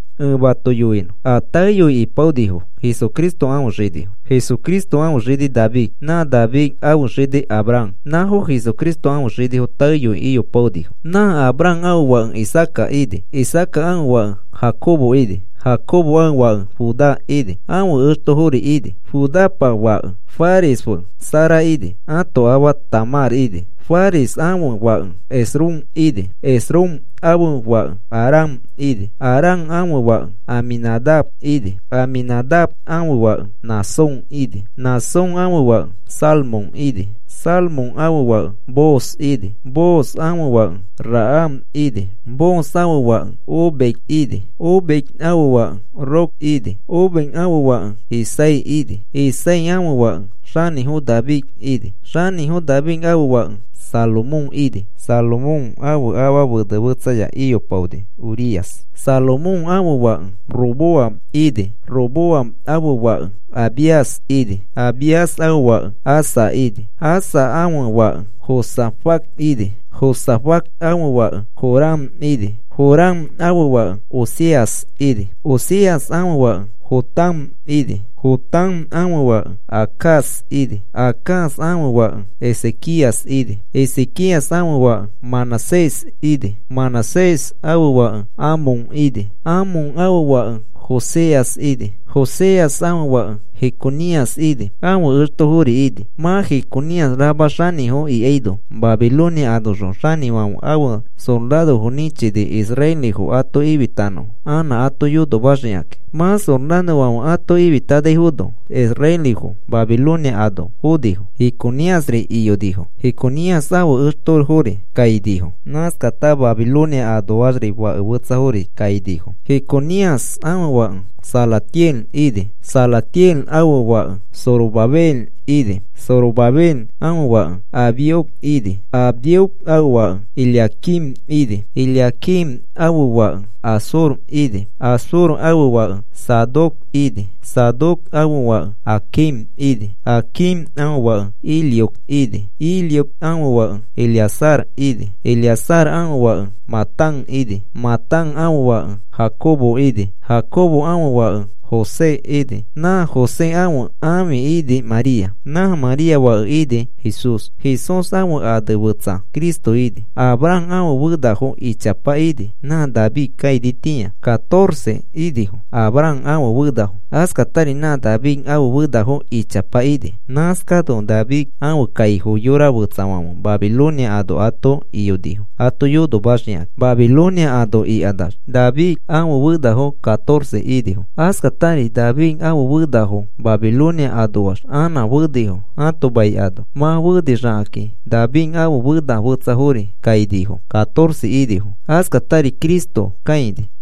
Ẽ mato yoinõ a taeyoi ipaonifo Jesucristo ãfe xinifo. Jesucristo ãfe xini David. Nã David ãfe xini Abraham. Nãfo Jesucristo ãfe xinifo taeyoi iyopaonifo. Nã Abraham ãfe fake Isaaca ini. Isaaca ãfe fake Jacobo ini. Jacobo fake Judá ini. Ãfe extofori ini. Judapa fake Fares fe Zara ini. Ãto afa Tamar ini. Fares ãfe fake Esrom ini. Esrom ãfe fake Aram ini. Aram ãfe fake Aminadab ini. Aminadab ãfe fake Naasón ini. Naasón ãfe fake Salmón ini. Salmón fake Booz ini. Booz ãfe afa Rahab ini. Booz ãfe fake Obed ini. Obed ãfe afa Rut ini. Obed ãfe fake Isaí ini. Isaí ãfe fake xanĩfo David ini. Xanĩfo David ãfe fake Salomón ini. Salomón ãfe ãfa fene fetsaya iyopaoni, Urías. Salomón ãfe fake Roboam ini. Roboam ãfe fake Abías ini. Abías ãfe fake Asa ini. Asa ãfe fake Josafat ini. Josafat ãfe fake Joram ini. Joram ãfe fake Ozías ini. Ozías ãfe fake Jotam ini. Jotam ãfe fake Acaz ini. Acaz ãfe fake Ezequías ini. Ezequías ãfe fake Manasés ini. Manasés ãfe fake Amón ini. Amón ãfe fake Josías ini. Josías ãfe fake Jeconías ini; ãfe extofori ini. Mã Jeconías rama xanĩfo ikaino, Babilonia anoxõ xanĩfãfe ãfe sorarofo nĩchini israelifo ato ifitanõfo anã ato yonomaxikakĩ. Mã sorarofãfe ato ifitanaifono israelifo Babilonia ano fonifo. Jeconíasri iyonifo. Jeconías ãfe extofori kainifo. Nãskata Babilonia anoax fake fetsafori kainifo. Jeconías ãfe fake Salatiel ini. Salatiel ãfe fake Zorobabel ini. Zorobabel ãfe fake Abiud ini. Abiud ãfe fake Eliaquim ini. Eliaquim ãfe fake Azor ini. Azor ãfe fake Sadoc ini. Sadoc ãfe fake Aquim ini. Aquim ãfe fake Eliud ini. Eliud ãfe fake Eleazar ini. Eleazar ãfe fake Matán ini. Matán ãfe fake Jacobo ini. Jacobo ãfe fake José ini. Nã José ãfe ãfi ini, María. Nã María fake ini, Jesús. Jesús ãfe ane fetsa Cristo ini. Abraham ãfe fenafo ichapa ini, nã David kainitĩa catorce inifo Abraham ãfe fenafo. Askatari nã David ãfe fenafo ichapa ini. Nãskano David ãfe kaifo yora fetsafãfe Babilonia ano ato iyonifo ato yonomaxikakĩ. Babilonia ano ikanax David ãfe fenafo catorce inifo. Askatari David ãfe fenafo Babilonia anoax anã fenifo ãto mai ano. Mã fenixakakĩ David ãfe fena fetsafori kainifo catorce inifo. Askatari Cristo kaini.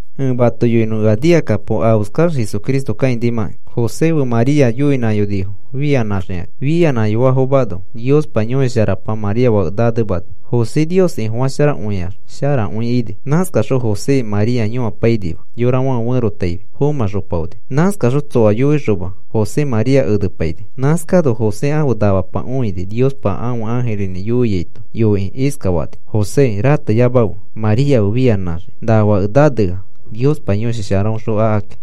Ẽ mato yoinõ ea nikakapo afeskax Jesucristo kãinimakĩ. José fe María yoinãyonifo fianãxikakĩ. Fianãyofafomano Niospa Yõshi Sharapa María fake nanemani. José Nios Ifofasharakõiax sharakõi ini. Nãskaxõ José María yõapainima yorafãfe ferotaifi. Fomãxopaoni. Nãskaxõ tsoa yoixoma José María enepaini. Nãskano José ãfe namapa õini Niospa ãfe ãjirinĩ yoiaito. Yoikĩ iskafani: “José, rateyamafe María fe fianãxiki. Na fake nanea Niospa Yõshi Sharaõxõ akaki.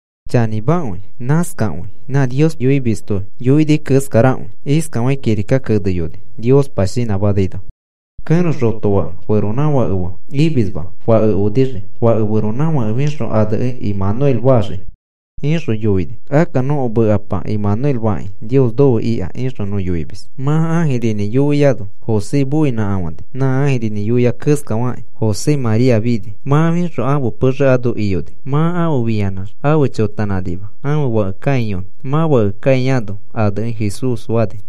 Chanĩmakõi nãskakõi nã Nios yoimisto yoini keskarakõi. Iskafakĩ kirika keneyoni Niospa shinãmanaino: Kẽro xotofake feronãfake fe imisma fake onixii. Fake feronãfake fixõ anekĩ Emanuel faxii, ixõ yoini. (Akka nõko mekapa Emanuel fakĩ, “Nios nofe ika,” ixõ nõ yoimis.) Mã ãjirinĩ yoiano José moinãkafani. Nã ãjirinĩ yoia keskafakĩ, José María fini. Mã fixõ ãfe pexe ano iyoni. Mã afe fĩanãx afe chotanãnima ãfe fake kãiyonõ. Mã fake kãiano anekĩ Jesús fani.